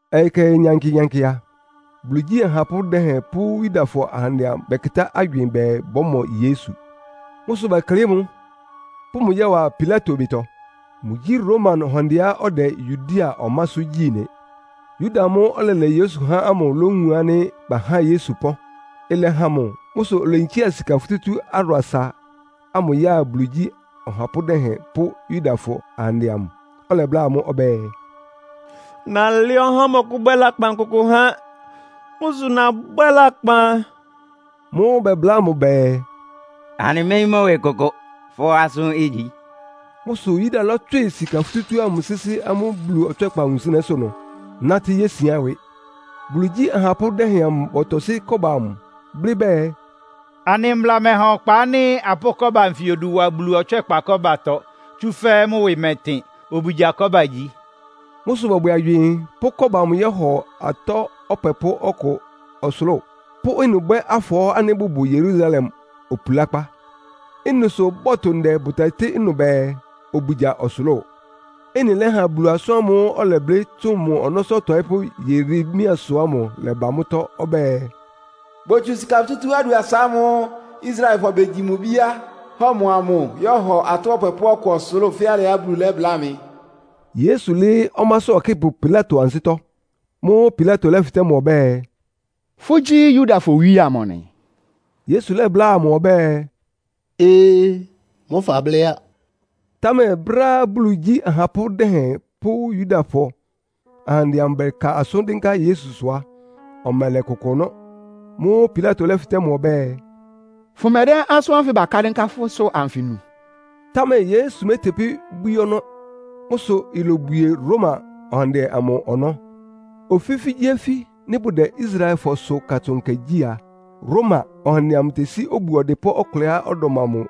Ɔyɩ kɛhɛ nyankɩ-nyankɩ a, Bulu igyí ahapʋ́ dɛhɛn pʋ́ Yudafɔ ahandɛ amʋ bɛkɩtá agywɩɩn bɛɛ, bɔ́mɔ Yesu. Mʋ́ sʋ bɛklɩ́ɩ mʋ, pʋ́ mʋ yɔ́wa Pilato ɩbɩtɔ. Mʋgyí Roma ɔhandɛá ɔdɛ Yudea ɔmásʋ́ gyí nɩ. Yuda amʋ́ʋ́ ɔlɛlɛ Yesu há ámʋ lówun ánɩ́ bahá Yesu pɔ́n. Ɩlɛhan mʋ. Mʋ́ sʋ oleyinkía sika futútú adʋasa ámʋ ya Bulu igyí ɔhapʋ́ dɛhɛn pʋ́ Yudafɔ ahandɛ amʋ. Ɔlɛbláa amʋ́ ɔbɛ́ɛ, “Nalɛ́ ɔhá ánɩ́ ɔmɔkʋ́bwɛ́ lakpan kʋkʋ há. Mʋ́ sʋ nabwɛ́ lakpan.” Mʋ́ʋ́ bɛbláa mʋ bɛɛ, “Anɩméyín mʋ́ ɩwɩ kʋkʋ. Fʋ́ asʋ́n igyi.” Mʋ́ sʋ Yuda lɔ́tswɩ sika futútú ámʋ sɩ́sɩ́ amʋ́ Bulu ɔtswɛ́kpa wunsɩnɛ́sʋ́ ɩnʋ, nátɩ́ yésián ɩwɩ. Bulu igyí ahapʋ́ dɛhɛn amʋ bɔtɔsɩ́ kɔ́ba amʋ, blɩ́ bɛɛ, “Anɩ mbla mɛha ɔkpa ánɩ́ apʋ́ʋ kɔ́ba anfɩ odu wa Bulu ɔtswɛ́kpa kɔ́batɔ, tsúfɛ́ mʋ́ ɩwɩ mɛtɩn. Obugya kɔ́ba igyi.” Mʋ́ sʋ bɔbwɛ agywɩɩn, pʋ́ kɔ́ba ámʋ yɔ́hɔ atɔ́ ɔpwɛpʋ́ ɔkʋ ɔsʋlʋ́ʋ, pʋ́ ɩnʋ bwɛ́ afɔɔ́ ánɩ́ bʋbʋ Yerusalem opulákpá. Ɩ́nɩ sʋ bɔtʋ ndɛ bʋtɛtɩ́ ɩnʋ bɛɛ, “Obugya ɔsʋlʋ́ʋ.” Ɩ́nɩ lɛ́ha Bulu asʋ́n ámʋ́ʋ́ ɔlɛblɩ́ tsʋn mʋ ɔnɔ́sʋ́ ɔtɔɩ́pʋ́ Yeremiasʋ ámʋ lɛ́ba mʋ́tɔ́. Ɔbɛ́ɛ, “Botsu sika futútú adʋasa ámʋ́ʋ́ Israelfɔ begyi mʋ ibíá, hɔ mʋ amʋ yɔ́hɔ atɔ́ ɔpwɛpʋ́ ɔkʋ ɔsʋlʋ́ʋ fɛ́ alɩá Bulu lɛ́bláa mɩ.” Yesu lɩ́ɩ́ ɔmásʋ́ ɔkɩ́pʋ Pilato ansɩ́tɔ́. Mʋ́ʋ́ Pilato lɛ́fɩtɛ́ mʋ ɔbɛ́ɛ, “Fʋ́gyí Yudafɔ owíe amʋ nɩ?” Yesu lɛ́bláa mʋ ɔbɛ́ɛ, “Ee, mʋ́ fablɩ́ á.” Támɛ brɛ́á Bulu igyí ahapʋ́ dɛhɛn pʋ́ Yudafɔ ahandɛ amʋ bɛka asʋ́n dɩ́nká Yesusʋ á, ɔmɛlɛ kʋkʋ ɔnɔ́. Mʋ́ʋ́ Pilato lɛ́fɩtɛ́ mʋ ɔbɛ́ɛ, “Fʋmɛdɛ́ asʋ́n ánfɩ bakla dɩnká fʋ́sʋ́ ánfɩ nu?” Támɛ Yesu métepí bwíí ɔnɔ́. Mʋ́ sʋ ilobwie Roma ɔhandɛ amʋ ɔnɔ́. Ofífígyíofí, nɩ́ bʋdɛ Israelfɔsʋ Katsʋn Nkɛ gyí a, Roma ɔhandɛ amʋ tesí obu ɔdɩpʋ́ ɔkʋlɛá ɔdɔm amʋ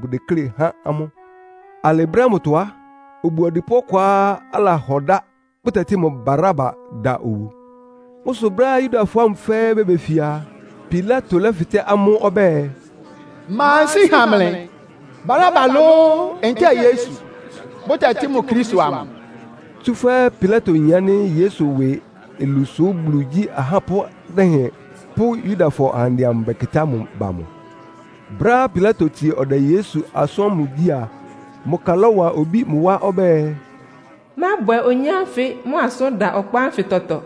bʋdeklé há amʋ́. Alɩ brɛ́ ámʋtɔ á, obu ɔdɩpʋ́ ɔkʋá alahɔ dá, bʋtɛtɩ́ mʋ Baraba da obu. Mʋ́ sʋ brɛ́á Yudafɔ ámʋ fɛ́ɛ́ bebefia a, Pilato lɛ́fɩtɛ́ amʋ́ ɔbɛ́ɛ, “Ma nsíi ha mlɩ? Baraba lóó, ntɛ́ɛ Yesu, bʋtɛtɩ́ mʋ Kristo amʋ?” Tsúfɛ́ Pilato yin ánɩ́ Yesu ɩwɩ olu sʋ́ Bulu igyí ahapʋ́ dɛhɛn pʋ́ Yudafɔ ahandɛ amʋ bakɩ́tá mʋ ba mʋ. Brɛ́á Pilato tsie ɔdɛ Yesu asʋ́n ámʋ gyí a, mʋ ka lɔ́wa obí mʋ wá ɔbɛ́ɛ, “Mábwɛ oyin ánfɩ mʋ asʋ́n da ɔkpa ánfɩ tɔtɔ.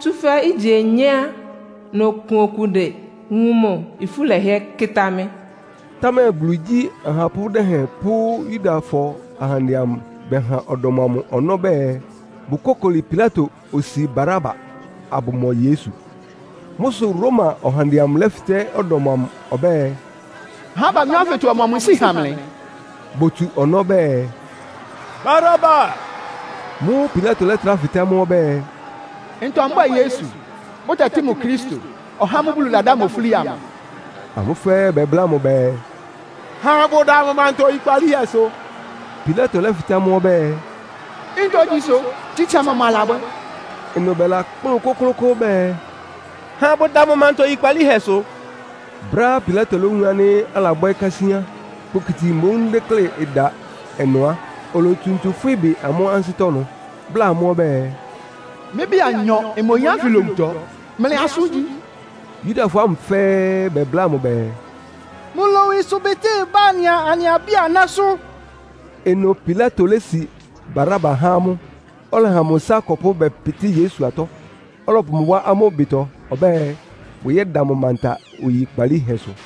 Tsúfɛ́ ígye onyé á, nokun okude wun mʋ, ifú lɛhɩɛ́ kɩ́tá mɩ́.” Támɛ Bulu igyí ahapʋ́ dɛhɛn pʋ́ Yudafɔ ahandɛ amʋ bɛha ɔdɔm amʋ ɔnɔ́ bɛɛ, bʋkókoli Pilato osi Baraba, abʋmɔ Yesu. Mʋ́ sʋ Roma ɔhandɛ amʋ lɛ́lafɩ́tɛ́ ɔdɔm amʋ ɔbɛ́ɛ, “Ahá abanyɔ́ ánfɩtɔ ɔmɔmʋ nsíi ha mlɩ?” Botsu ɔnɔ́ bɛɛ, “Baraba!” Mʋ́ʋ́ Pilato lɛ́trá fɩtɛ́ amʋ́ ɔbɛ́ɛ, “Ntɔ mbwɛ́ɛ Yesu, bʋtɛtɩ́ mʋ Kristo, (ɔhá ámʋ́ʋ́ Bulu ladá mʋ ofúli amʋ)?” Amʋ́ fɛ́ɛ́ bɛbláa mʋ bɛɛ, “Ha abʋda mʋ manta oyikpalíhɛsʋ!” Pilato lɛ́fɩtɛ́ amʋ́ ɔbɛ́ɛ, “Ntogyi sʋ! Tsitsa mɔmʋ alabwɛ́?” Ɩnʋ bɛlakplʋ́n kʋ́klʋ́kʋ́ʋ́ bɛɛ, “Ha abʋda mʋ manta oyikpalíhɛsʋ!” Brɛ́á Pilato lówun ánɩ́ alabwɛ́ kásíán, kpokiti mboún deklé ɩda ɩnʋ á, olotsu ntsu fwɩ́ ɩbɩ amʋ́ ansɩ́tɔ́ ɩnʋ, bláa amʋ́ ɔbɛ́ɛ, “Mɩ́ ɩbɩ anyɔ ɩma oyin ánfɩ lowutɔ. Mlɩ asʋ́n igyi.” Yudafɔ ámʋ fɛ́ɛ́ bɛbláa mʋ bɛɛ, “Mʋ lowu ɩsʋbɩtɩ́ ɩbá anɩa anɩ abí-anásʋ́!” Ɩnʋ Pilato lési Baraba há amʋ́, ɔlɛha mʋ ɩsá akɔpʋ́ bɛpɩtɩ́ Yesu atɔ́, ɔlɔpʋ mʋ wá amʋ́ ɩbɩtɔ ɔbɛ́ɛ, bʋyɛ́da mʋ manta oyikpalíhɛsʋ.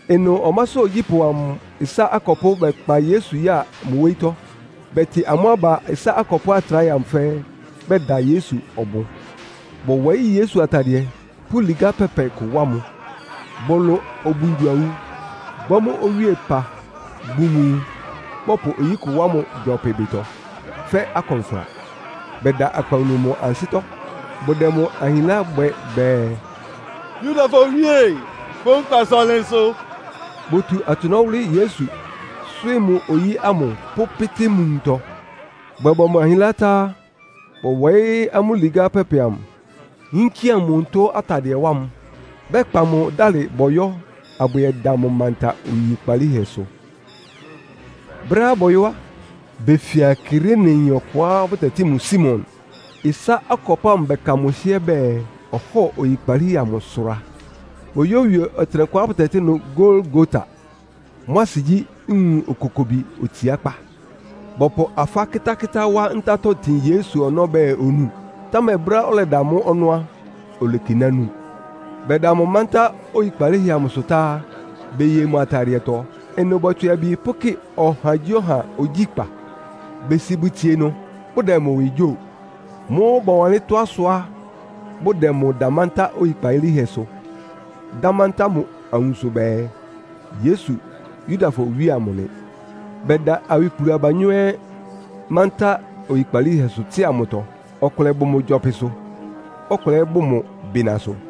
Ɩnʋ ɔmásʋ́ ogyípʋ́ amʋ ɩsá akɔpʋ́ bɛkpa Yesu ya mʋ wóyítɔ́. Bɛtɩ amʋ́ aba ɩsá akɔpʋ́ atráhɛ amʋ fɛ́ɛ́, bɛda Yesu ɔbʋn. Bɔwɔɩ́ Yesu atadɩɛ, pʋ́ ligá pɛpɛ kʋ wá mʋ. Bɔlʋ obungyo-awu, bwɛ́ mʋ́ owíepa bun mʋ nwun. Bɔpʋ oyí kʋ wá mʋ gyɔpɩ ɩbɩtɔ, fɛ́ akɔnfra. Bɛda akpawunu mʋ ansɩ́tɔ́, bʋdɛ mʋ ahinlá bwɛ bɛɛ, “Yudafɔ Owíe, fʋ́ nkpasʋ ɔnlɩnsʋ!” Botu atsʋnɔ́ wʋ́lɩ́ Yesu, swɩ́ɩ́ mʋ oyí ámʋ pʋ́pɩ́tɩ́ mʋ nwuntɔ. Bɔbwɛ mʋ ahinlá tá á, bɔwɔɩ́ amʋ́ ligá pɛpɛ amʋ, yínkía mʋ onutó atadɩɛ wá mʋ, bɛkpa mʋ dálɩ bɔyɔ́ abʋyɛda mʋ manta oyikpalíhɛsʋ. Brɛ́á bɔyɔ́ á, befia Kireneyin ɔkʋá bʋtɛtɩ́ mʋ Simon. Ɩsá akɔpʋ́ ámʋ bɛka mʋ hɩ́ɛ́ bɛɛ, ɔhɔ́ɔ oyikpalíhɛ amʋ sʋra. Boyówie ɔtɩnɛkʋá bʋtɛtɩ́ ɩnʋ Golgota. Mʋ́ asɩ gyí, “Nwun Okokobi Otsiákpá.” Bɔpʋ afá kɩ́tákɩ́tá wá ntátɔ́ tin Yesu ɔnɔ́ bɛɛ onúu, támɛ brɛ́á ɔlɛda mʋ́ ɔnɔ́ á, olekiná nu. Bɛda mʋ mántá oyikpalíhɛ amʋsʋ tá á, beye mʋ atadɩɛtɔ. Ɩnʋ bɔtswɩ abi pʋ́kɩ ɔhagyíɔha ogyíkpá. Besi bʋtsie ɩnʋ, bʋdɛ mʋ ɩwɩ gyóo. Mʋ́ʋ́ bɔwanlɩ́n tɔ́á sʋá bʋdɛ mʋ da mántá oyikpalíhɛsʋ, dá mántá mʋ awunso bɛɛ, “Yesu, Yudafɔ owíe amʋ nɩ.” Bɛda awikplu abanyɔ́ ɛ́ mántá nyikpalíhɛsʋ tsɩ́a mʋtɔ. Ɔkʋlɛ bʋ mʋ gyɔpɩsʋ, ɔkʋlɛ ɛ́ bʋ mʋ bɩnasʋ.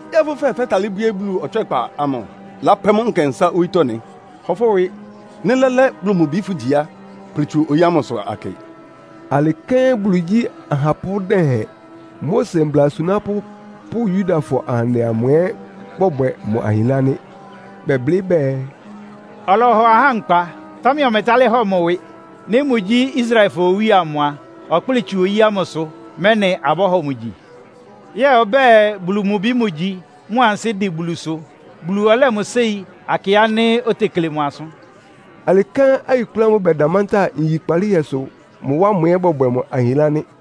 “Yɛ́ɛ fʋ́ fɛɛ fɛ́talɩ́ bwíé Bulu ɔtswɛ́kpa amʋ, lápwɛ́ mʋ́ nkɛnsá owítɔ́ nɩ́? Hɔ fʋ́ ɩwɩ! Nɩ́ lɛ́lɛ́ Bulu mʋ Bi fʋ́gyi á, kplɩ tsu oyí ámʋsʋ akɩ.” Alɩ kɛ́n Bulu igyí ahapʋ́ dɛhɛn, Mose mbla asunápʋ́ pʋ́ Yudafɔ ahandɛ amʋ ɛ́ bɔbwɛ mʋ ahinlá nɩ́. Bɛblɩ́ bɛɛ, “Ɔlɔhɔ ahá nkpa, támɛ ɔmɛtálɩ́ hɔ mʋ ɩwɩ. Nɩ́ mʋgyí Israelfɔ owíe amʋ a, ɔkplɩ́ɩ tsu oyí ámʋsʋ, mɛ́nɩ abɔ́hɔ mʋ gyi. Yɛ́ɛ ɔbɛ́ɛ Bulu mʋ Bi mʋgyi, mʋ ansɩ́ dɩn Bulusʋ. Bulu ɔlɛ́ mʋ séi, akɩ ánɩ́ otekle mʋ asʋ́n.” Alɩ kɛ́n awikplu ámʋ́ʋ́ bɛda mántá nyikpalíhɛsʋ mʋ wá ámʋ ɛ́ bɔbwɛ mʋ ahinlá nɩ́.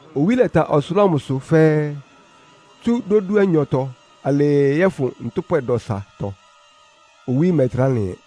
Owí lɛta ɔsʋlʋ́ʋ amʋsʋ fɛ́ɛ́, tsú dódúanyɔtɔ alɩɩ yɔ́fʋn ntʋ́pwɛ dɔsatɔ. Owí mɛtrá lɩn ɛ.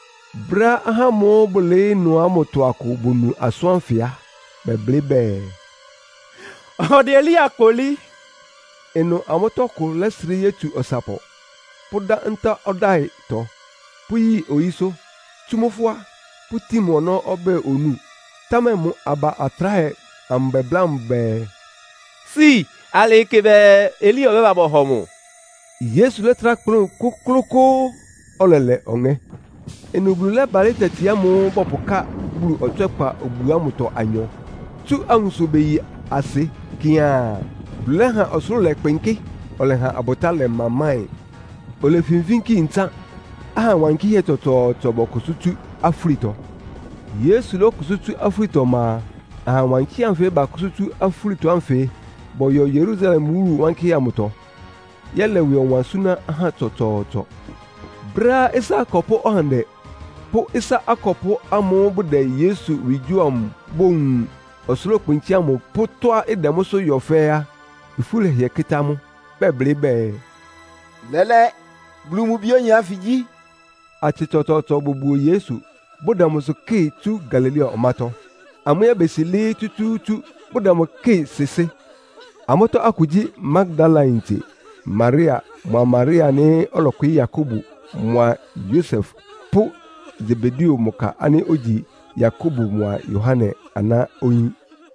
Brɛ́á ahá ámʋ́ʋ́ bʋlɩɩ́ ɩnʋ ámʋtɔ akʋ bonu asʋ́n ánfɩ á, bɛblɩ́ bɛɛ, “Ɔdɛ Elia kpolí.” Ɩnʋ amʋ́tɔ́ ɔkʋ lɛ́srɩ́ yótsu ɔsapɔ, pʋ́dá ntá ɔdáɩtɔ, pʋ́yi oyísʋ́, tsú mʋ́ fʋ́á, pʋ́tin mʋ ɔnɔ́ ɔbɛ́ɛ onúu. Támɛ mʋ aba atráhɛ amʋ bɛbláa mʋ bɛɛ, “Si, alɩɩ kɩ bɛɛ Elia ɔbɛ́ba bɔhɔ mʋ.” Yesu lɛ́trá kplʋ́n kʋ́klʋ́kʋ́ʋ́, ɔlɛlɛ ɔŋɛ́. Ɩnʋ Bulu lɛ́balɩ́ tati ámʋ́ʋ́ bɔpʋká Bulu Ɔtswɛ́kpa obu ámʋtɔ anyɔ, tsú awunso beyi asɩ kɩaan. Bulu lɛ́ha ɔsʋlʋ́ʋ lɛkpɩnkɩ́, ɔlɛha abʋtá lɛmamáɩn. Olefinfínki ntsán, aha wankɩ́hɛ́ tsɔtsɔɔtsɔ bɔkʋsʋ́ tsú afúlitɔ. Yesu kʋsʋ́ tsú afúlitɔ ɔma a, aha wankɩ́hɛ́ anfɩ́ bakʋ́sʋ́ tsú afúlitɔ ánfɩ bɔyɔ Yerusalem wúlu wankɩ́hɛ́ amʋtɔ, yɛ́lɛ ɩwɩ ɔwan súná ahá tsɔtsɔɔtsɔ. Brɛ́á ɩsá akɔpʋ́ ɔhandɛ pʋ́ ɩsá akɔpʋ́ ámʋ́ʋ́ bʋdɛ Yesu ɩwɩ gyóo amʋ bowun ɔsʋlʋ́kpɩnkɩ́ ámʋ pʋ́ tɔ́á ɩdɛ mʋ́sʋ́ yɔ fɛ́ɛ́ á, ifú lɛhɩɛ kɩ́tá amʋ́, bɛblɩ́ bɛɛ, “Lɛ́lɛ́, Bulu mʋ Bi óyin ánfɩ gyí.” Atsɩ tsɔtsɔɔtsɔ bobuo Yesu, bʋdɛ mʋsʋ kɩ́ɩ tsu Galilea ɔmátɔ́. Amʋ́ ɛ́ besi lɩɩ́ tsútsúútsú, bʋdɛ mʋ kɩ́ɩ sɩsɩ́. Amʋ́tɔ́ akʋ gyí, Magdalayintse Maria mʋa Maria ánɩ́ ɔlɔkwɩɩ́ Yakobo mʋa Yosef pʋ́ Sebedeo mʋ ka ánɩ́ ogyi Yakobo mʋa Yohane aná oyín.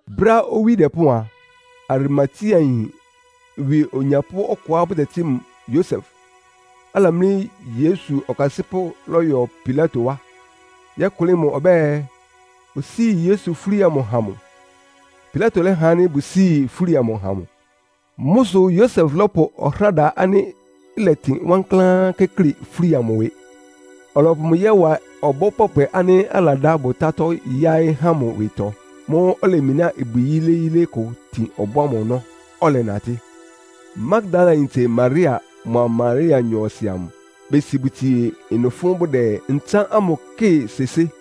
Brɛ́á owí dɛpɔ́ɔn a, Arimateayin ɩwɩ onyapʋ́ ɔkʋá bʋtɛtɩ́ mʋ Yosef, alamlí Yesu ɔkasɩ́pʋ́ lɔ́yɔ Pilato wá, yɔ́kʋlɩ́ mʋ ɔbɛ́ɛ, osíi Yesu fúli amʋ ha mʋ. Pilato lɛ́ha ánɩ́ bʋsíi fúli amʋ ha mʋ. Mʋ́ sʋ Yosef lɔ́pʋ ɔhráda ánɩ́ ɩlɛtɩn wankláán kɩ́klɩ fúli amʋ ɩwɩ, ɔlɔpʋ mʋ yɔ́wa ɔbɔ́ pɔpwɛ ánɩ́ aladá bʋtátɔ́ yáɩ́ há mʋ ɩwɩtɔ. Mʋ́ʋ́ olemináa ibwi yíléyílé kʋ tin ɔbɔ́ ámʋ ɔnɔ́, ɔlɛnatɩ́. Magdalayintse Maria mʋa Maria nyɔɔsɩ amʋ besi bʋtsie ɩnʋ fʋ́n bʋdɛ ntsán ámʋ kɩ́ɩ sɩsɩ́.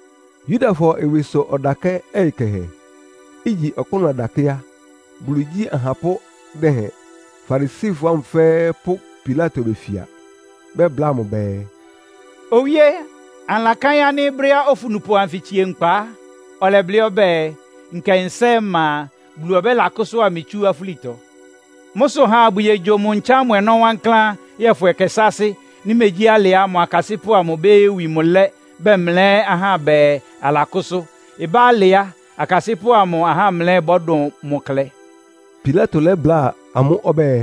Yudafɔ ɩwɩsʋ ɔdakɛ́ ɔyɩ kɛhɛ, igyi ɔkpʋ́nʋ́ ɔdakɛ́ á, Bulu igyí ahapʋ́ dɛhɛn, Farisifɔ ámʋ fɛ́ɛ́ pʋ́ Pilato befia. Bɛbláa mʋ bɛɛ, “Owíe, anɩlakáɩ́n ánɩ́ brɛ́á ofunupʋ anfɩ tsie nkpa á, ɔlɛblɩ́ ɔbɛ́ɛ, ‘Nkɛnsá ɔma a, Bulu ɔbɛ́lakʋ́sʋ́a mɩ tsú afúlitɔ.’ Mʋ́ sʋ ha abʋyogyo mʋ ntsán ámʋ ɔnɔ́ wankláán, yɔ́fʋn ɛkɛ sáásɩ́. Nɩ́ megyí alɩ á, mʋ akasɩ́pʋ́ amʋ bóyówi mʋ lɛ́, bɛmlɛ́ ahá bɛɛ alakʋ́sʋ́. Ɩbá alɩ á, akasɩ́pʋ́ amʋ ahámlɛ́ bɔ́dʋn mʋ klɛ.” Pilato lɛ́bláa amʋ́ ɔbɛ́ɛ,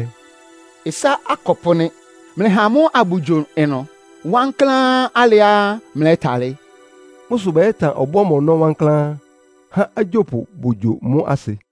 “Ɩsá akɔpʋ́ nɩ́. Mlɩha amʋ́ abʋyogyo ɩnʋ wankláán alɩá mlɛ́talɩ́.” Mʋ́ sʋ bɛyɛ́tan ɔbɔ́ ámʋ ɔnɔ́ wankláán, há agyópʋ bogyo mʋ́ asɩ.